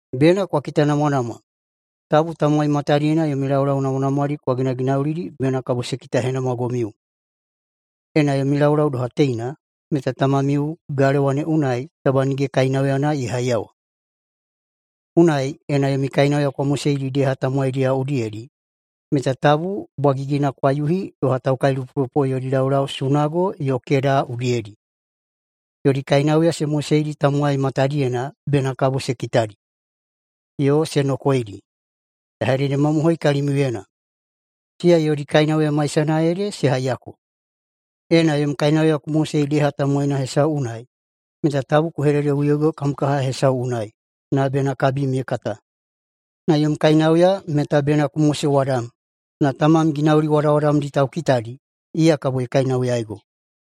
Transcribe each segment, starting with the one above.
“Bena kwa kitanamwanamwa, tabu tamowai matadiyena yomi laulau namwanamwadi kwa ginaginaulidi bena kabo se kitahenamwagomiu. Ena yomi laulau doha teina, meta tamamiu galewa ne unai taba nige kainauyana ye haiyawa. Unai ena yomi kainauya kwa moseidi deha tamowaidiyao udiyedi meta tabu bwagigina kwa yuhi doha taukailupolupo yodi laulau sunago yo keda udiyedi, yodi kainauya se moseidi tamowai matadiyena bena kabo se kitadi yo se nokoedi. Ya hededemamohoi kalimiuyena: Siya yodi kainauya maisana ede se haiyako. Ena yom kainauya ku mosei deha tamowaina hesau unai meta tabu ku hededeꞌuyoigo kam kaha hesau unai na bena kabim ye kata. Na yom kainauya meta bena ku mosewadam. Na Tamam ginauli wadawadamdi taukitadi, iya kabo ye kainauyaigo.”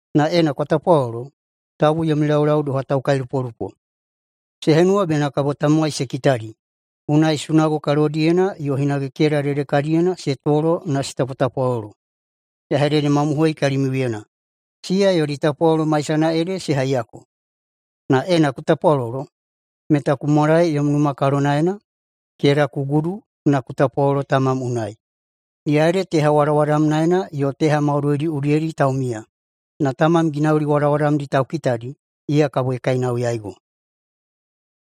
“Na ena kwa tapwalolo, tabu yomi laulau doha taukailupolupo. Se henuwa bena kabo tamowai se kitadi, unai sunago kalodiyena yo hinage keda dedekadiyena se tolo na se tapwatapwalolo. Ya hededemamohoi kalimiuyena: Siya yodi tapwalolo maisana ede se haiyako. Na ena ku tapwalolo, meta ku mwalae yom numa kalonaena, keda ku gudu na ku tapwalolo Tamam unai, iya ede teha wadawadamnaena yo teha maudoidi udiyedi taumiya. Na Tamam ginauli wadawadamdi taukitadi, iya kabo ye kainauyaigo.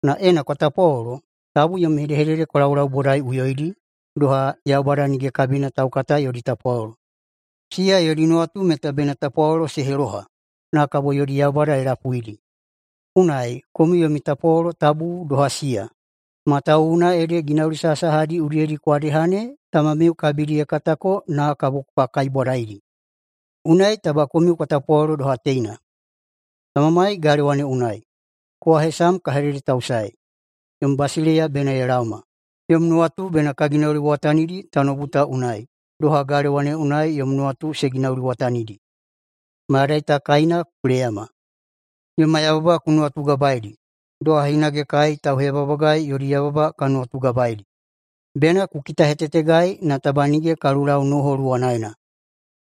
Na ena kwa tapwalolo, tabu yomi hedehedede kwa laulaubodaiꞌuyoidi, doha Yaubada nige kabina taukata yodi tapwalolo. Siya yodi nuwatu meta bena tapwalolo se heloha, na kabo yodi yaubada ye lapuidi. Unai komiu yomi tapwatapwalolo tabu doha siya, matawuwuna ede ginauli sahasahadi udiyedi kwa deha ne Tamamiu kabidi ye katako na kabo kwa kaibwadaidi. Unai taba komiu kwa tapwalolo doha teina: ‘Tamamai galewa ne unai! Kowa hesam ka hededetausaei. Yom basileiya bena ye laoma. Yom nuwatu bena ka ginauliwatanidi tanoubu ta unai, doha galewa ne unai yom nuwatu se ginauliwatanidi. Mayadai ta kaina ku leyama. Yoma yababa ku nuwatugabaeidi, doha hinage kai tauheyababagai yodi yababa ka nuwatugabaeidi. Bena ku kitahetetegai na taba nige ka lulau noho luwanaena,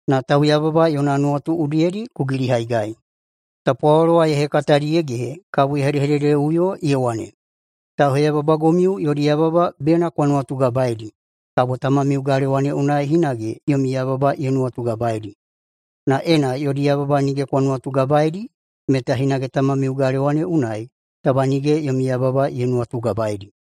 na tauyababa yona nuwatu udiyedi ku gilihaigai.’” [Tapwalolo wa ye hekatadi ye gehe kabo ye hedehededeꞌuyo ye wane,] “Tauheyababagomiu yodi yababa bena kwa nuwatugabaeidi, kabo Tamamiu galewa ne unai hinage yomi yababa ye nuwatugabaeidi. Na ena yodi yababa nige kwa nuwatugabaeidi meta hinage Tamamiu [galewa ne unai] taba nige yomi yababa ye nuwatugabaeidi.”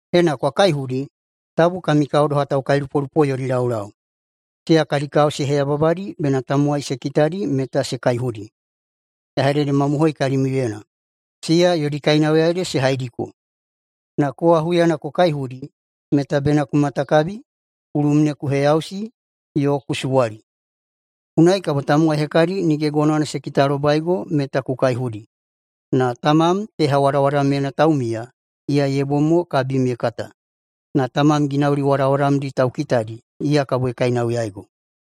“Ena kwa kaihudi, tabu kami kao doha taukailupolupo yodi laulau. Siya kadi kao se heyababadi bena tamowai se kitadi meta se kaihudi. Ya hededemamohoi kalimiuyena: Siya yodi kainauya ede se haidiko. Na kowa huyana ku kaihudi meta bena ku matakabi, kulum ne ku heyausi yo ku suwali. Unai kabo tamowai hekadi nige gonowana se kitalobaigo meta ku kaihudi, na Tamam teha wadawadamyena taumiya, iya ye bom mo kabim ye kata. Na Tamam ginauli wadawadamdi taukitadi, iya kabo ye kainauyaigo.”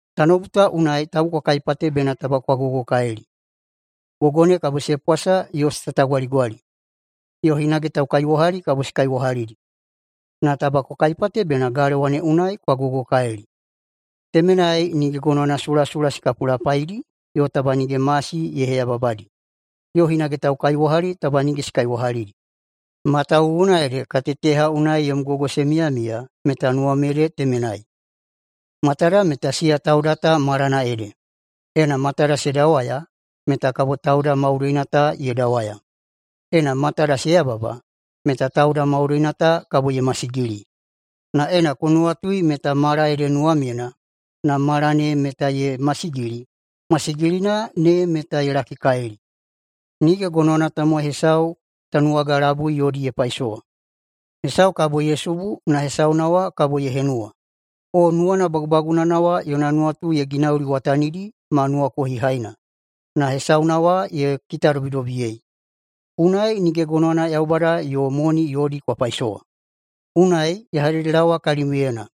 “Tanoubu ta unai tabu kwa kaipate bena taba kwa gogokalili. Gogo ne kabo se pwasa yo se tatagwaligwali, yo hinage taukaiwahali kabo se kaiwahalidi. Na taba kwa kaipate bena galewa ne unai kwa gogokalili. Temenai nige gonowana sulasula se kapulapaidi yo taba nige masi ye heyababadi, yo hinage taukaiwahali taba nige se kaiwahalidi. Matawuwuna ede kaiteya teha unai yom gogo se miyamiya, meta nuwam ede temenai. Matada meta siya tauda ta malana ede. Ena matada se dawaya meta kabo tauda maudoina ta ye dawaya. Ena matada se yababa meta tauda maudoina ta kabo ye masigili. Na ena ku nuwatui meta mala ede nuwamyena, na mala ne meta ye masigili, masigilina ne meta ye lakikalili. Nige gonowana tamowai hesau tanuwaga labui yodi ye paisowa. Hesau kabo ye subu na hesauna wa kabo ye henuwa. O nuwana bagubagunana wa yona nuwatu ye ginauliwatanidi ma nuwakohihaina, na hesauna wa ye kitadobidobiyei. Unai nige gonowana Yaubada yo moni yodi kwa paisowa. Unai ya hededelaowa kalimiuyena: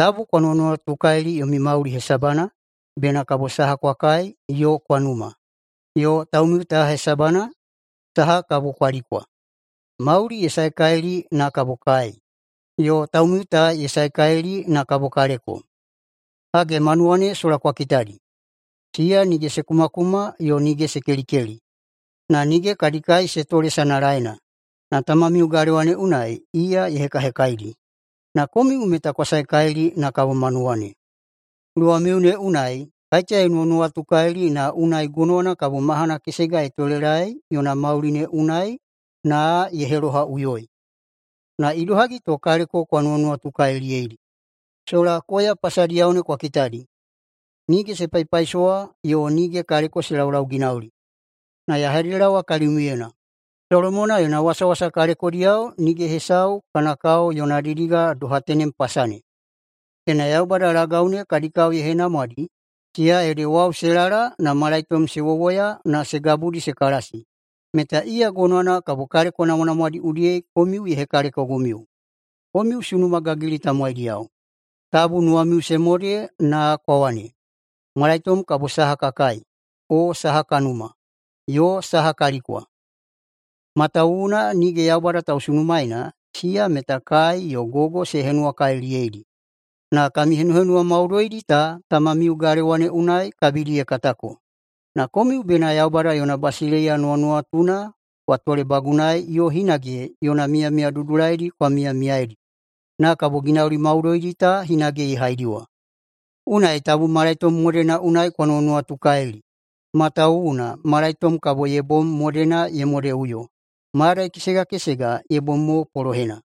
Tabu kwa nuwanuwatukalili yomi mauli hesabana, bena saha kabo kwa kai yo kwa numa, yo taumiu ta hesabana, saha kabo kwa likwa. Mauli ye saekalili na kabo kai, yo taumiu ta ye saekalili na kabo kaleko! Hage, manuwa ne sola kwa kitadi, siya nige se kumakuma, yo nige se kelikeli, na nige kadi kai se tole sanalaena, na Tamamiu galewa ne unai, iya ye hekahekaidi. Na komiu meta kwa saekalili na kabo manuwa ne. Luwamiu ne unai kaiteya ye nuwanuwatukalili na unai gonowana kabo mahana kesega ye tolelaei yona mauli ne unai na ye helohaꞌuyoi? Na idohagi to kaleko kwa nuwanuwatukaliliyeidi? Sola koya pasadiyao ne kwa kitadi. Nige se paipaisowa yo nige kaleko se laulauginauli. Ya hededelaowa kalimiuyena: Solomona yona wasawasa kalekodiyao nige hesau kana kao yona didiga doha tenem pasa ne. Ena Yaubada lagau ne kadi kao ye henamwadi, siya ede wau se lala na malaitom [se wowoya na] se gabudi se kalasi, meta iya gonowana kabo kaleko namwanamwadi udiyedi komiu ye hekalekogomiu. Komiu sunuma gagilidi tamowaidiyao! Tabu nuwamiu se mode na kwa wane, ‘Malaitom kabo saha ka kai? O saha ka numa? Yo saha ka likwa?’ Matawuwuna nige Yaubada tausunumaeina, siya meta kai yo gogo se henuwakaliliyeidi, na kami henuhenuwa maudoidi ta tamamiu galewa ne unai kabidi ye katako. Na komiu bena Yaubada yona basileiya nuwanuwatuna kwa tolebagunai yo hinage yona miyamiya dudulaidi kwa miyamiyaidi, na kabo ginauli maudoidi ta hinage ye haidiwa. Unai tabu malaitom modena unai kwa nuwanuwatukalili, matawuwuna malaitom kabo ye bom modena ye modeꞌuyo. Mayadai kesega kesega ye bom mo polohena.”